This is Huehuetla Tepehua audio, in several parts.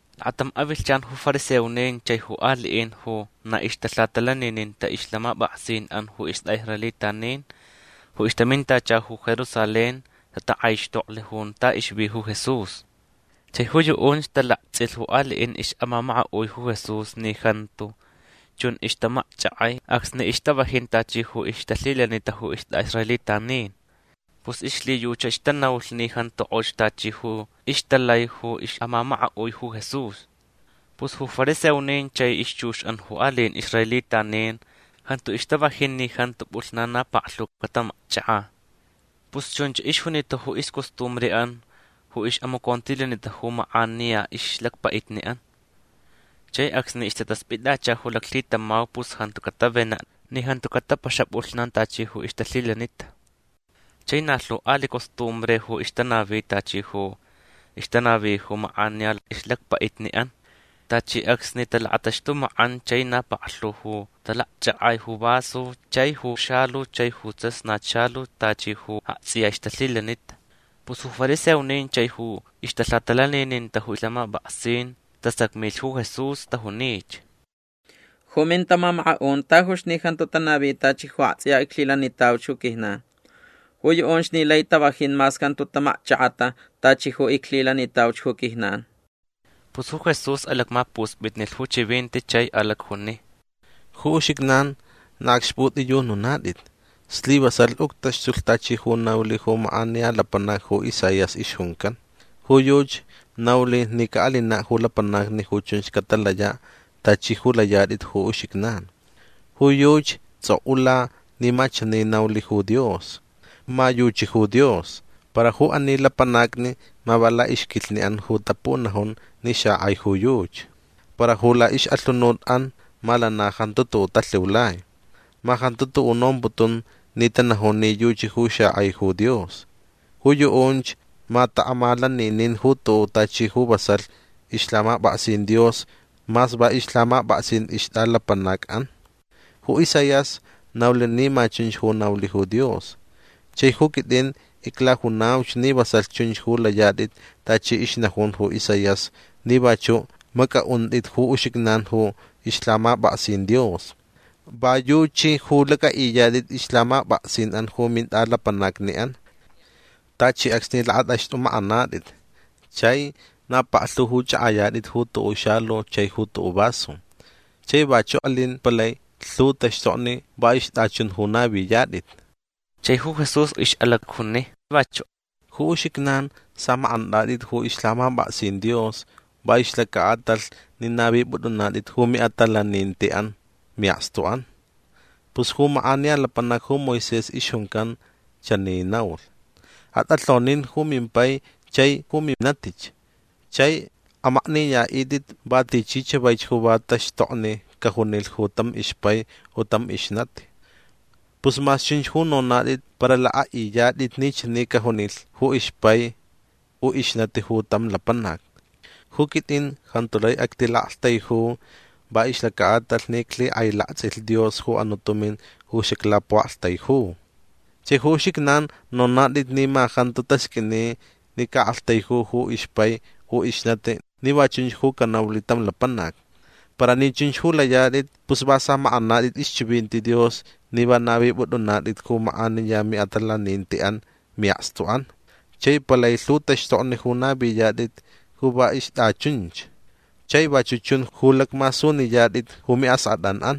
Lakatam avilhchan ju fariseonin chai ju aliʼin ju na ixtalhatalanininta ixlhamapʼaksinʼan ju istʼaʼisraelitanin ju ixtamintacha ju Jerusalén tatakʼaixtoklh junta ixvi ju Jesús. Chai ju yuʼunch talaktsʼilh ju aliʼin ixʼamamakaʼui ju Jesús ni jantu chun ixtamakchʼakʼai acsni ixtavajin tachi ju ixtalhilanita ju istʼaʼisraelitanin. Pus ixlhiyuchach tanaulh ni jantu kʼox tachi ju ixtalai ju ixʼamamakaʼui ju Jesús. Pus ju fariseonin chai ixchuxʼan ju aliʼin israelitanin jantu ixtavajin ni jantu pʼulhnan na paklhu catamakchʼakʼa. Pus chunch ixjunita ju iscostumbreʼan ju ixʼamacontilanita ju makʼaniya ixlacpaʼitniʼan. Chai acsni ixtataspʼittacha ju laclhitamau pus jantu catavenaʼ ni jantu catapaxaʼ pʼulhnan tachi ju ixtalhilanita. Chai na lhu aliʼ costumbre ju ixtanavi tachi ju ixtanavi ju makʼaniya ixlacpaʼitniʼan. Tachi acsni talakʼataxtʼumakʼan chai na paklhu ju talakchʼakʼai ju vaso chai ju xalu chai ju tsasnat xalu tachi ju aktsʼiya ixtalhilanita. Pus ju fariseonin chai ju ixtalhatalanininta ju lhamapʼaksin tasacmilh ju Jesús. Tajunich: ―Ju mintamamakaʼun tajuch ni jantu tanavi tachi ju aktsʼiya iclhilanitauch ju quijnan. Ju yuʼunch ni lai tavajin mas jantu tamakchʼakʼata tachi ju iclhilanitauch ju quijnan. Pus ju Jesús alacmapuspitnilh ju chivinti chai alacjuni: ―Ju uxijnan na acxpʼutʼiyununatʼit. Slivasalh uctaxtulh tachi ju naulh ju makʼaniya lapanac ju Isaías ixjuncan. Ju yuchi naulh ni caʼalinaʼ ju lapanacni ju chunch catalayaʼ tachi ju layatʼit ju uxijnan. Ju yuchi tsʼokʼula ni ma chani naulh ju Dios: Ma yuchi ju Dios. Para ju ani lapanacni ma va laʼixquilhniʼan ju tapunajun ni xakʼai ju yuchi. Para ju laʼixʼalhunutʼan ma lana jantu tuʼuʼ talhiulai. Ma jantu tuʼuʼ nomputun ni tanajun ni yuchi ju xakʼai ju Dios. Ju yuʼunch ma taʼamalaninin ju tuʼuʼ tachi ju vasalh ixlhamapʼaksin Dios mas va ixlhamapʼaksin ixtʼalapanacʼan. Ju Isaías naulh ni ma chunch ju naulh ju Dios. Chai ju quitʼin iclajunauch ni vasalh chunch ju layatʼit tachi ixnajun ju Isaías ni vachuʼ macʼaʼuntʼit ju uxijnan ju ixlhamapʼaksin Dios. Va yuchi ju lacʼaʼiyatʼit ixlhamapʼaksinʼan ju mintʼalapanacniʼan. Tachi acsni lakʼatʼaxtʼumakʼanatʼit chai na paklhu ju chʼakʼayatʼit ju tuʼuʼ xalu chai ju tuʼuʼ vaso. Chai vachuʼ alin palai lhu taxtokni va ixtʼachun ju naviyatʼit. Chai ju Jesús ixʼalacjuni vachuʼ: ―Ju uxijnan samakʼantʼatʼit ju ixlhamapʼaksin Dios va ixlacaʼatalh ni navipʼutʼunatʼit ju miʼatalanintiʼan miʼakstuʼan. Pus ju makʼaniya lapanac ju Moisés ixjuncan chani naulh: “Atʼalhonin ju mimpai chai ju minatich. Chai amakniyaʼitʼit va tichi chavaich ju va taxtokni cajunilh ju tam ixpai u tam ixnati”. Pus mas chunch ju nonatʼit para lakʼaʼiyatʼit ni chani cajunilh ju ixpai u ixnati ju tam lapanac: “Ju quitʼin jantu lai actilaʼaktaiju va ixlacaʼatalh ni iclhikʼailaktsʼilh Dios ju anuʼ tumin ju xaclapuʼaktaiju”. Chai ju uxijnan nonatʼit ni ma jantu tasqʼuini ni caʼaktaiju ju ixpai u ixnati ni va chunch ju canaulh tam lapanac. Para ni chunch ju layatʼit pus va samakʼanatʼit ixchivinti Dios ni va navipʼutʼunatʼit ju makʼaniya miʼatalanintiʼan miʼakstuʼan. Chai palai lhu taxtokni ju naviyatʼit ju va ixtʼachunch. Chai vachuʼ chun ju lacmasuniyatʼit ju miʼaskʼatʼanʼan.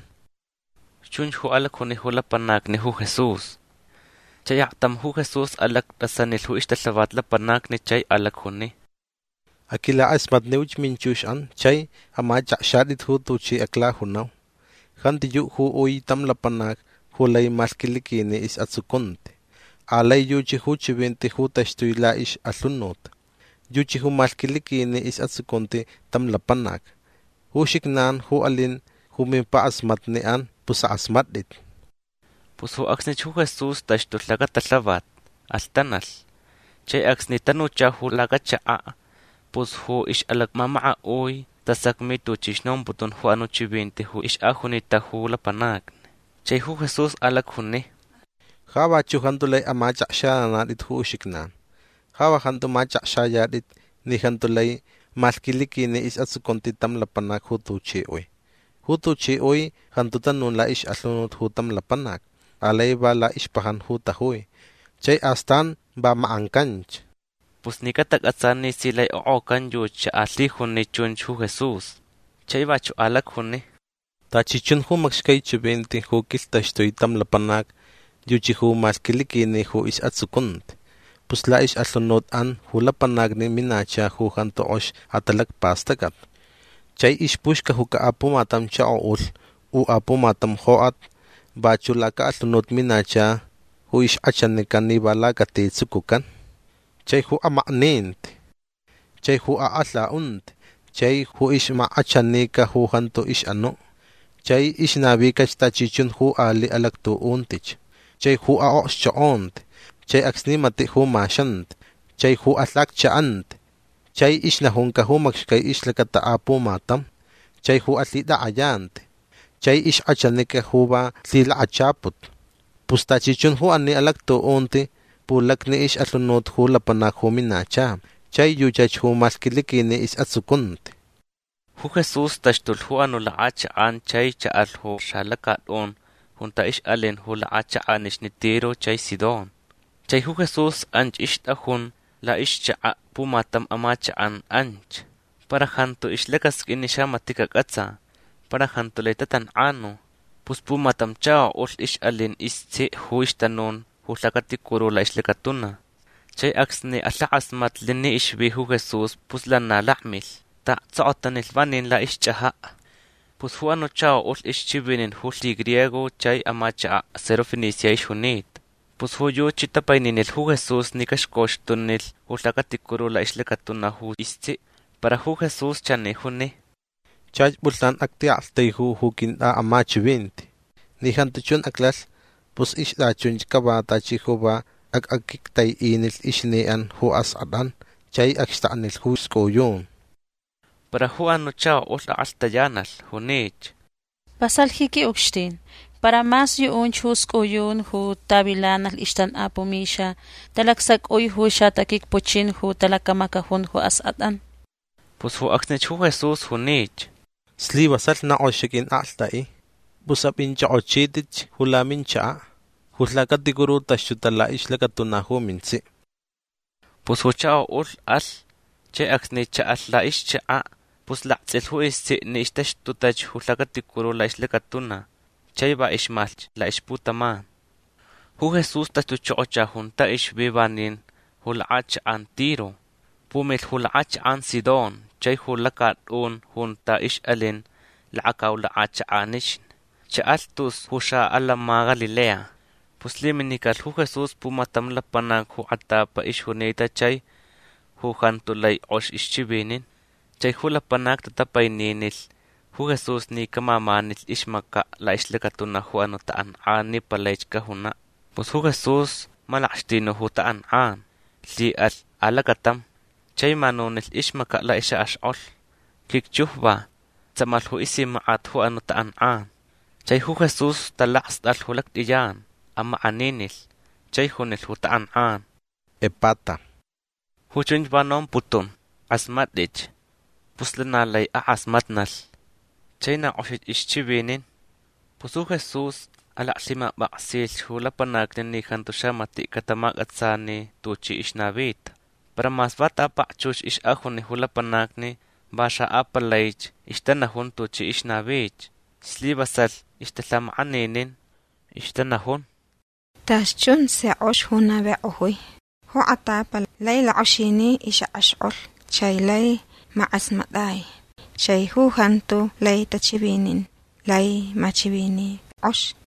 ―Chunch ju alacjuni ju lapanacni ju Jesús. Chai aktam ju Jesús alactʼasanilh ju ixtalhavat lapanacni chai alacjuni: ―Aquilakʼasmatniuch minchuxʼan chai amachʼakxatʼit ju tuchi aclajunau. Jantiyuʼ ju ui tam lapanac ju lai malhquiliquini isʼatsucunti. Alai yuchi ju chivinti ju taxtui laʼixʼalhunut. Yuchi ju malhquiliquini isʼatsucunti tam lapanac. Ju uxijnan ju alin ju mimpakʼasmatniʼan pus akʼasmatʼit. Pus ju acsnich ju Jesús taxtulh lacatalhavat. Alhtanalh. Chai acsni tanucha ju lacachakaʼ pus ju ixʼalacmamakaʼui tasacmi tuchi ixnomputun ju anuʼ chivinti ju ixʼajunita ju lapanacni. Chai ju Jesús alacjuni: ―Ja vachuʼ jantu lai amachʼakxananatʼit ju uxijnan. Ja va jantu machʼakxayatʼit ni jantu lai malhquiliquini isʼatsucunti tam lapanac ju tuchi ui. Ju tuchi ui jantu tanun laʼixʼalhunut ju tam lapanac. Alai va laʼixpajan ju tajui chai astan va makʼancanch. Pus ni catacʼatsa ni si lai okʼocan yuchi xaʼalaclhijuni chunch ju Jesús. Chai vachuʼ alacjuni: ―Tachi chun ju macxcai chivinti ju quilhtaxtui tam lapanac yuchi ju malhquiliquini ju isʼatsucunti. Pus laʼixʼalhunutʼan ju lapanacni minacha ju jantu kʼox atalacpastʼacʼat. Chai ixpuxcajuca apumatam chakoʼulh u apumatam jokʼat. Vachuʼ lacaʼalhunut minacha ju ixkʼachanica ni va lacati tsucucan. Chai ju amakninti. Chai ju akʼalhaʼunti. Chai ju ixmakkʼachanica ju jantu ixʼanuʼ. Chai ixnavicach tachi chun ju aliʼ alactuʼuntich. Chai ju aʼokxchokʼonti. Chai acsni matiʼ ju maxanti. Chai ju alhacchaʼanti. Chai ixnajunca ju macxcai ixlacata apumatam. Chai ju alhitakʼayanti. Chai ixkʼachanica ju va lhilakachaput. Pus tachi chun ju ani alactuʼunti pulacni ixʼalhunut ju lapanac ju minacha. Chai yuchach ju malhquiliquini isʼatsucunti. Ju Jesús taxtulh ju anuʼ lakʼachakʼan chai chaʼalh ju xalacatʼun junta ixʼalin ju lakʼachakʼanixni Tiro chai Sidón. Chai ju Jesús anch ixtʼajun laʼixchakaʼ pumatam amachakʼan anch. Para jantu ixlacasqʼuin ni xamatiʼ cacʼatsa. Para jantu lai tatankʼanu. Pus pumatam chakoʼulh ixʼalin istsiʼ ju ixtanun ju lhacaticuru laʼixlacatuna. Chai acsni kʼalhakʼasmatlh ni ixvi ju Jesús pus lana lakmilh. Taʼaktsokotanilh vanin laʼixchʼajaʼ. Pus ju anuʼ chakoʼulh ixchivinin ju lhigriego chai amachakaʼ Sirofenicia ixjunita. Pus ju yuchi tapaininilh ju Jesús ni caxcoxtunilh ju lhacaticuru laʼixlacatuna ju istsiʼ. Para ju Jesús chani juni: ―Chach pʼulhnan actiʼaktaiju ju quintʼaʼamachivinti. Ni jantu chun aclalh pus ixtʼachunch cava tachi ju va acʼaquictaiʼinilh ixniʼan ju askʼatʼan chai acxtaknilh ju scʼuyun. Para ju anuʼ chakoʼulh akʼalhtayanalh. Junich: ―Vasalh ji quiʼucxtin. Para mas yuʼunch ju scʼuyun ju tavilanalh ixtankʼapuʼ mixa talacsacʼui ju xataquicpuchin ju talacamacajun ju askʼatʼan. Pus ju acsnich ju Jesús junich: ―Slivasalh na kʼox xaquinkʼalhtʼaʼi. Pus apʼinchʼokʼochitʼich ju laminchakaʼ. Ju lhacaticuru taxtuta laʼixlacatuna ju mintsiʼ. Pus ju chakoʼulh alh. Chai acsni chaʼalh laʼixchakaʼ pus laktsʼilh ju istsiʼ ni ixtaxtutach ju lhacaticuru laʼixlacatuna chai va ixmalhch laʼixputaman. Ju Jesús taxtuchokocha junta ixvi vanin ju lakʼachakʼan Tiro. Pumilh ju lakʼachakʼan Sidón chai ju lacatʼun junta ixʼalin lakacau lakʼachakʼanixni. Chaʼalh tus ju xaʼatantsʼin Galilea. Pus lhiminicalh ju Jesús pumatam lapanac ju kʼatapa ixjunita chai ju jantu lai kʼox ixchivinin. Chai ju lapanacni tatapaininilh ju Jesús ni camamanilh ixmacaʼ laʼixlacatuna ju anuʼ takʼankʼan ni palaich cajunaʼ. Pus ju Jesús malakxtinu ju takʼankʼan. Lhiʼalh alacatam. Chai manunilh ixmacaʼ laʼixʼakʼaxkʼolh. Quicchujva. Tsamalh ju isimakʼat ju anuʼ takʼankʼan. Chai ju Jesús talakstʼalh ju lactʼiyan. Amakʼaninilh. Chai junilh ju takʼankʼan: ―Epata. Ju chunch va nomputun: Akʼasmatʼich. Pus lana laich akʼasmatnalh. Chai na kʼoxich ixchivinin. Pus ju Jesús alaclhimapʼaksilh ju lapanacni ni jantu xamatiʼ catamacʼatsani tuchi ixnavita. Para mas va ta pakchux ixʼajuni ju lapanacni va xaʼapalaich ixtanajun tuchi ixnavich. Slivasalh ixtalhamakʼaninin. Ixtanajun: ―Tachi chun si kʼox ju navikʼojui. Ju kʼatapa lai lakʼoxini ixʼakʼaxkʼolh. Chai laich makʼasmatʼai. Chai ju jantu lai tachivinin lai machivini kʼox.